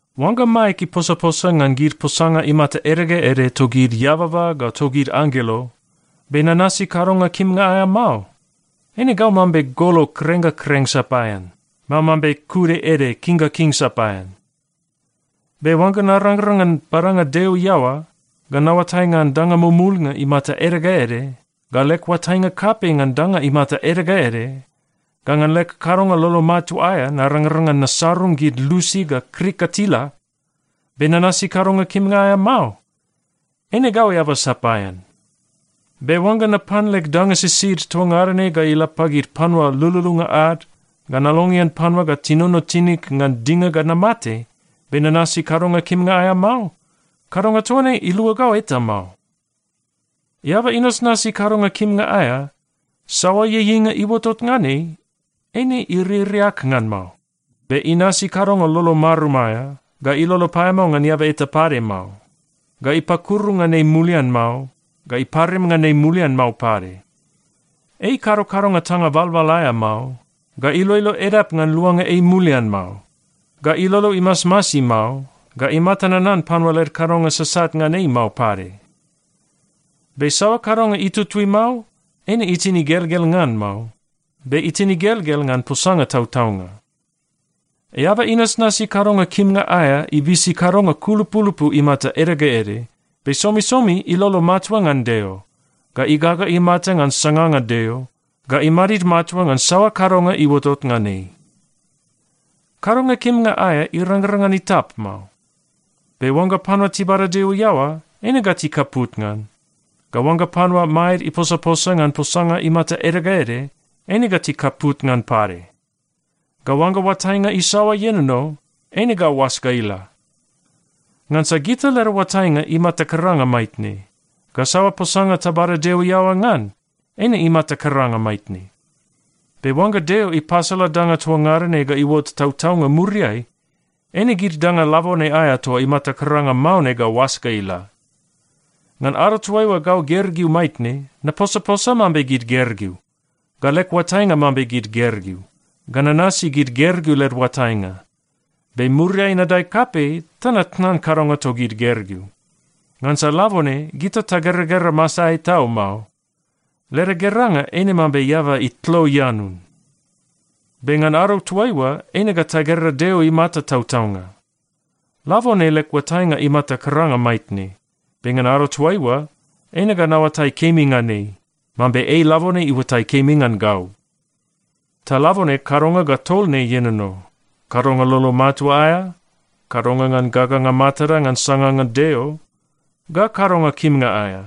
Oangga maeg iposaposa ngan gid posanga imata ede ga ede togid eababa ga togid anggelo, be nanasi kadonga kimnga aea mao, eine gau mambe golo kreng ga kreng sapaean, mao mambe kude ede king ga king sapaean. Be oangga narangrang ngan badanga Deo iaoa, ga naoatai ngan danga mumulnga imata ede ga ede, ga leg oatainga kapei ngan danga imata ede ga ede, ga ngan leg kadonga lolo matua aea narangrang ngan nasarung gid lusi ga krik ga tila, be nanasi kadonga kimnga aea mao, eine gau eaba sapaean. Be oangga napan leg danga sisid toa ngada ne ga ila pagid panua lululunga ad, ga nalongean panua ga tinono tinig ngan dinga ga namate, be nanasi kadonga kimnga aea mao, kadonga toa ne ilua gau eta mao. Eaba inasnasi kadonga kimnga aea, saoa ieieinga iuotot ngan ei, eine iririak ngan mao. Be inasi kadonga lolo marum aea, ga ilolo paeamao ngan eaba eta pade mao, ga ipakuru ngan ei mulian mao, ga iparim ngan ei mulian mao pade. Ei ikado kadonga tanga balbal aea mao, ga iloilo edap ngan luanga ei mulian mao, ga ilolo imasmasi mao, ga imata nanan panua led kadonga sasat ngan ei mao pade. Be saoa kadonga itutui mao, eine itin igelgel ngan mao, be itin igelgel ngan posanga tautaunga. Eaba inasnasi kadonga kimnga aea ibisi kadonga kulupulupu imata ede ga ede, be somisomi ilolo matua ngan Deo, ga igaga imata ngan sanganga Deo, ga imadid matua ngan saoa kadonga iuotot ngan ei. Kadonga kimnga aea irangrang ngan itap mao, be oangga panua tibada Deo iaoa, eine ga tikaput ngan. Ga oangga panua maed iposaposa ngan posanga imata ede ga ede, eine ga tikaput ngan pade. Ga oangga oatainga isaoa ienono, eine ga oas ga ila. Ngansa gita leda oatainga imata karanga maitne, ga saoa posanga tabada Deo iaoa ngan, eine imata karanga maitne. Be oangga Deo ipasala danga toa ngada ne ga iuot tautaunga muriai, eine gid danga labone aea toa imata karanga mao ne ga oas ga ila. Ngan ado toaiua gau gergeu maitne, naposaposa mambe gid gergeu, ga leg oatainga mambe gid gergeu, ga nanasi gid gergeu led oatainga. Be muriai nadae kapei ta natnan kadonga togid gergeu. Ngansa labone gita tageragera masaeai tau mao. Leda geranga eine mambe eaba itlo ianun. Be ngan ado toaiua, eine ga tagera Deo imata tautaunga. Labone leg oatainga imata karanga maitne, be ngan ado toaiua, eine ga naoatai kemi ngan ei, mambe ei labone iuatai kemi ngan gau. Ta labone kadonga ga tol ne ienono: kadonga lolo matua aea, kadonga ngan gaganga matada ngan sanganga Deo, ga kadonga kimnga aea.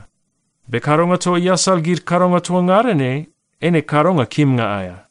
Be kadonga toa iasal gid kadonga toa ngada ne eine kadonga kimnga aea.